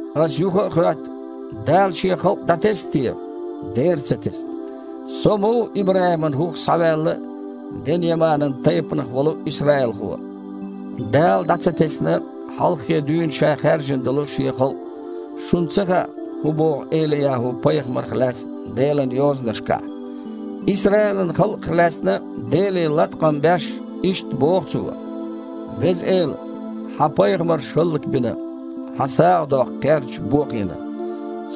Аса юха а хоьтту: «Дала Шен халкъ дІатесна те?» Дера ца тесна! Со а ма ву ИбрахІиман хІух схьаваьлла а, Бен-Яманан тайпанах волу а исраилхо. Дала дІа ца тесна хьалххе дуьйна Ша хаьржина долу Шен халкъ. Шуна ца хаьа, хІун боху Эли-ЯхІу-пайхамарах лаьцна Делан Йозанашкахь? Исраилан халкъах лаьцна Деле латкъам беш, иштта боху цо: «Веза Эла! Хьан пайхамарш хІаллакбина, Хьан сагІа доккху кхерчаш бохийна.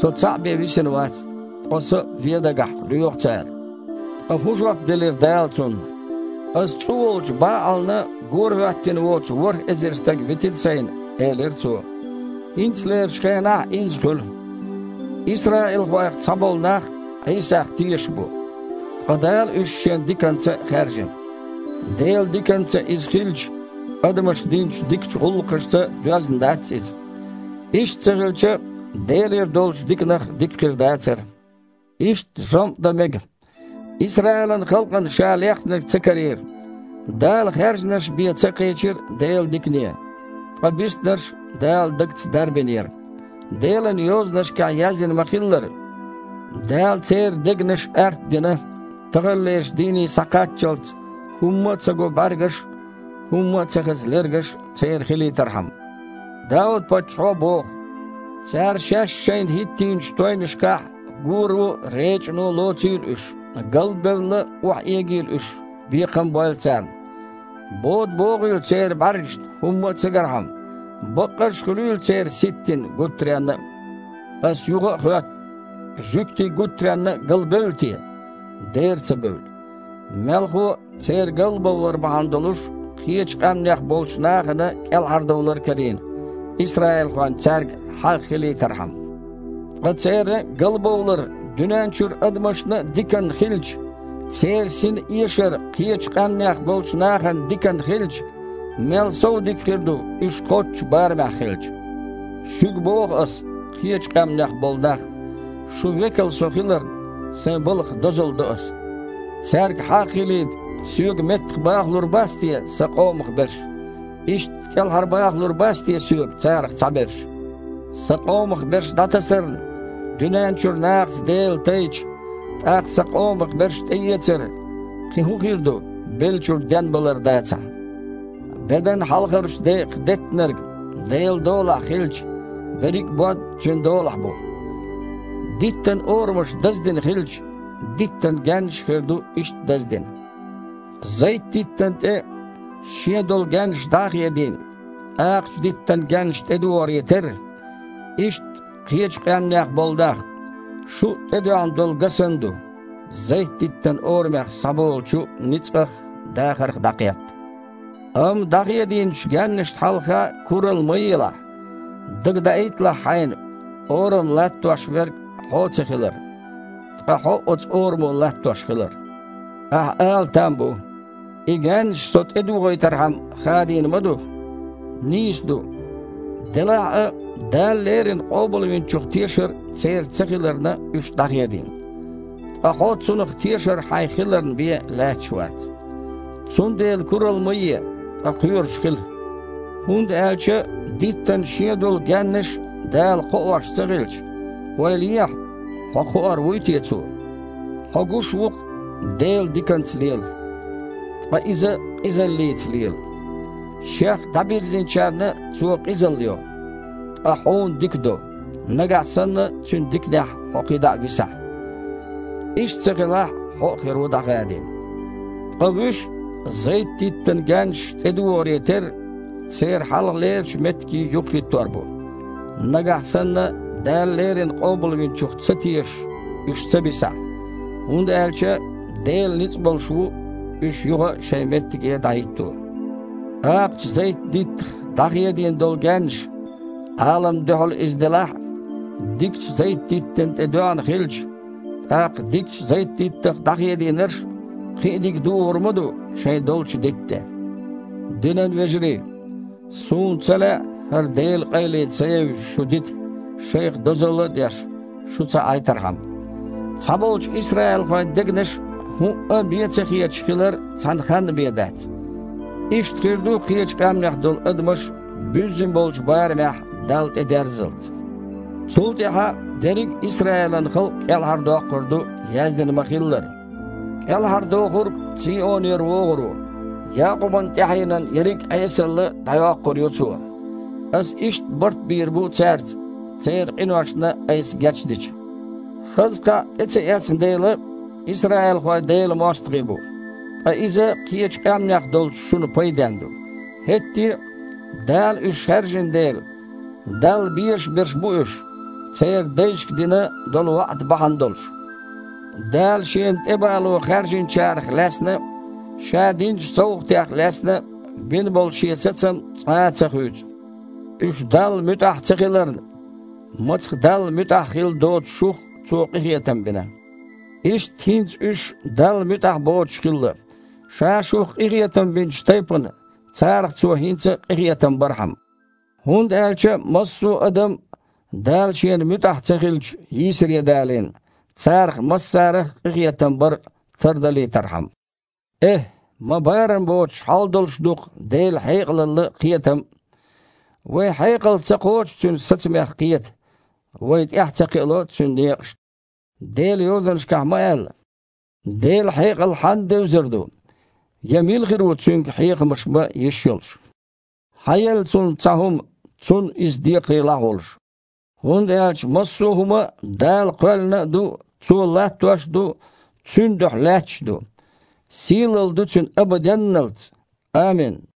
Со цхьаъ бен висина вац, ткъа со а вен дагахь лоьху цара». Ткъа хІун жоп делира Дала цунна? «Аса цІу волчу БаІална горахІоьттина воцу ворхІ эзар стаг витина Сайна», – элира Цо. ХІинцалерчу хенахь а изза хуьлу: исраилхойх цхьаболу нах Іийсах тешаш бу, ткъа Дала уьш Шен диканца хаьржина. Делан диканца иза хилча, адамаша динчу дикачу гІуллакхашца доьзна дац иза. Иштта ца хилча, Делера долчу диканах дика хир дацара. Иштта жамІ дан мега: Исраилан халкъана ша лехнарг ца карийра. Дала хаьржинарш бен ца кхечира Делан дикане. Ткъа биснарш Дала дагца дарбинера. Делан Йозанашкахь яздина ма-хиллара: «Дала церан дегнаш артдина, таханлерчу дийне схьакхаччалц хІумма а ца го бІаьргаш а, хІумма а ца хеза лергаш а церан хилийтархьама». Дауд-паччахьо боху: «Цара шаьш-шайна хІиттийначу тойнашкахь гуро а, речІано а лоцийла уьш. Гал а бевлла, охьаэгийла уьш, бекхам а бойла царна. Бода богІийла церан бІаьргашна хІумма а ца гархьама, баккъаш а хуьлийла церан ситтина гуттаренна а». Аса юха а хоьтту: «Жуьгтий гуттаренна а галбевлла те?» Дера ца бевлла! Мелхо а, церан галбовлар бахьана долуш кхечу къаьмнех болчу нахана кІелхьардовлар карийна, исраилхойн цаьрга хьагІ хилийтархьама. Ткъа церан галбовлар дуьнен чуьра адамашна а диканна хилча, церан синан эшар кхечу къаьмнех болчу нахана диканна хилча, мел сов дика хир ду, уьш кхоччуш барамехь хилча! Шуьга боху аса, кхечу къаьмнех болу нах: шун векал со хиларна, сайн балхах дозалла до аса. Цаьрга хьагІ хилийта соьга меттахбахалур бац те сан къомах берш, иштта кІелхьарбахалур бац те соьга царах цхьаберш? Сан къомах берш дІатасарна, дуьнен чуьра нахаца Дела тайча, тІаккха сан къомах берш тІеэцар кхин хІун хир ду, беллачуьра денбалар дацахь?! Бедан хьалхарчу декъах деттинарг Делан долахь хилча, берриг а бод Цуьнан долахь бу. Диттан орамаш даздина хилча, диттан гаьннаш а хир ду иштта даздина. Зайт-диттана тІе, шен долу гаьннаш дІа а хедийна, акхачу диттан гаьннаш тІедогІаре терра, иштта, кхечу къаьмнех болу нах, шу а тІедоьгІна долу га санна ду, зайт-диттан орамех схьаболучу ницкъах а, дахарх а дІакхетта. Амма дІахедийначу гаьннашна хьалха куралла ма елахь. Дагадаийталахь хьайна, орам латтош верг хьо ца хилар, ткъа хьо оцу орамо латтош хилар. Ахьа ала там бу: «И гаьннаш со тІедогІийтархьама хадийна ма ду». Нийса ду. Делахь а, Дала леррина Къобалвинчух тешар церан ца хиларна, уьш дІахедийна, ткъа хьо Цунах тешар хьайн хиларна бен лаьтташ вац. Цундела куралла ма е, ткъа кхоьруш хила. ХІунда аьлча диттан шен долу гаьннаш а Дала кхоош ца хилча, ойла ехьа: хьо кхоор вуй те Цо? Хьо гуш ву-кх: Дела диканца лела, ткъа Иза къизаллица лела. Шех дІабирзинчарна Цо къизалла йо, ткъа хьуна дика до, нагахь санна Цуьнан диканехь хьо кхидІа а висахь. Иштта ца хилахь, хьо а хир ву дІахадийна. Ткъа вуьш а, зайт-диттана гаьннаш тІедогІаре терра, церан хьалхалерчу меттиге юхахІиттор бу, нагахь санна Дала леррина Къобалвинчух ца тешаш уьш ца бисахь, хІунда аьлча Дела ницкъ болуш ву, уьш юха а шайн меттиге дІахІитто. Акхачу зайт-диттах дІахедийна долу гаьннаш, Іаламна дуьхьал иза делахь а, дикачу зайт-диттана тІе доьгІна хилча, тІаккха дикачу зайт-диттах дІахедийнарш кхин а дика дугІур ма ду шайн долчу дитта тІе. Динан вежарий! Суна ца лаьа, хІара Делан къайле ца евзаш шу дита, шайх дозалла а деш, шу ца Іайтархьама. Цхьаболчу исраилхойн дегнаш хІуъа а бен ца хеташ хилар цхьана ханна а бен дац. Иштта хир ду, кхечу къаьмнех долу адамаш буьззина болчу барамехь Далла тІедерззалц. Цул тІаьхьа дерриг а Исраилан халкъ кІелхьардоккхур ду, яздина ма-хиллара: « КІелхьардохург Цийонера вогІур ву. Якъубан тІаьхьенан ерриг а Іесалла дІайоккхур ю Цо. Аса иштта барт бийр бу цаьрца, церан къиношна Айса гечдича». Хаза кхаъ тІе ца эцна дела, исраилхой Делан мостагІий бу, ткъа иза кхечу къаьмнех долчу шуна пайденна ду. ХІетте а, Дала уьш хаьржина дела, Далла безаш берш бу уьш, церан дайшка дина долу ваІда бахьана долуш. Дала Шена тІебало хаьржинчарах лаьцна а, Ша динчу совгІатех лаьцна а бина болу Шен сацам цкъа а ца хуьйцу. Уьш Далла муьтІахь ца хиларна, мацах Далла муьтІахь хилла доцучу шух Цо къинхетам бина. Иштта хІинца уьш Далла муьтІахь боцуш хилла, Ша шух къинхетам бинчу тайпана, царах Цо хІинца къинхетам бархьама. ХІунда аьлча массо а адам Дала Шена муьтІахь ца хиллачу йийсаре далийна, царах массарах а къинхетам бар тардалийтархьама. ЭхІ, ма барам боцуш хьал долуш ду-кх Делан хьекъалалла а, кхетам а! Вайн хьекъал ца кхочу Цуьнан сацамех кхета, вай тІаьхьа ца кхиало Цуьнан некъашна! Делан Йозанашкахь ма аьлла: «Делан хьекъал хьанна девзар ду, я мила хир ву Цуьнга хьехамаш бан йиш йолуш? Хьан елла Цунна цхьа хІума, цунна Иза декхарийлахь а волуш?» ХІунда аьлча массо а хІума Дала кхоьллина а ду, Цо латтош а ду, Цуьнан дуьхьа лаьтташ а ду. Сийлалла ду Цуьнан абаденналц! Амин!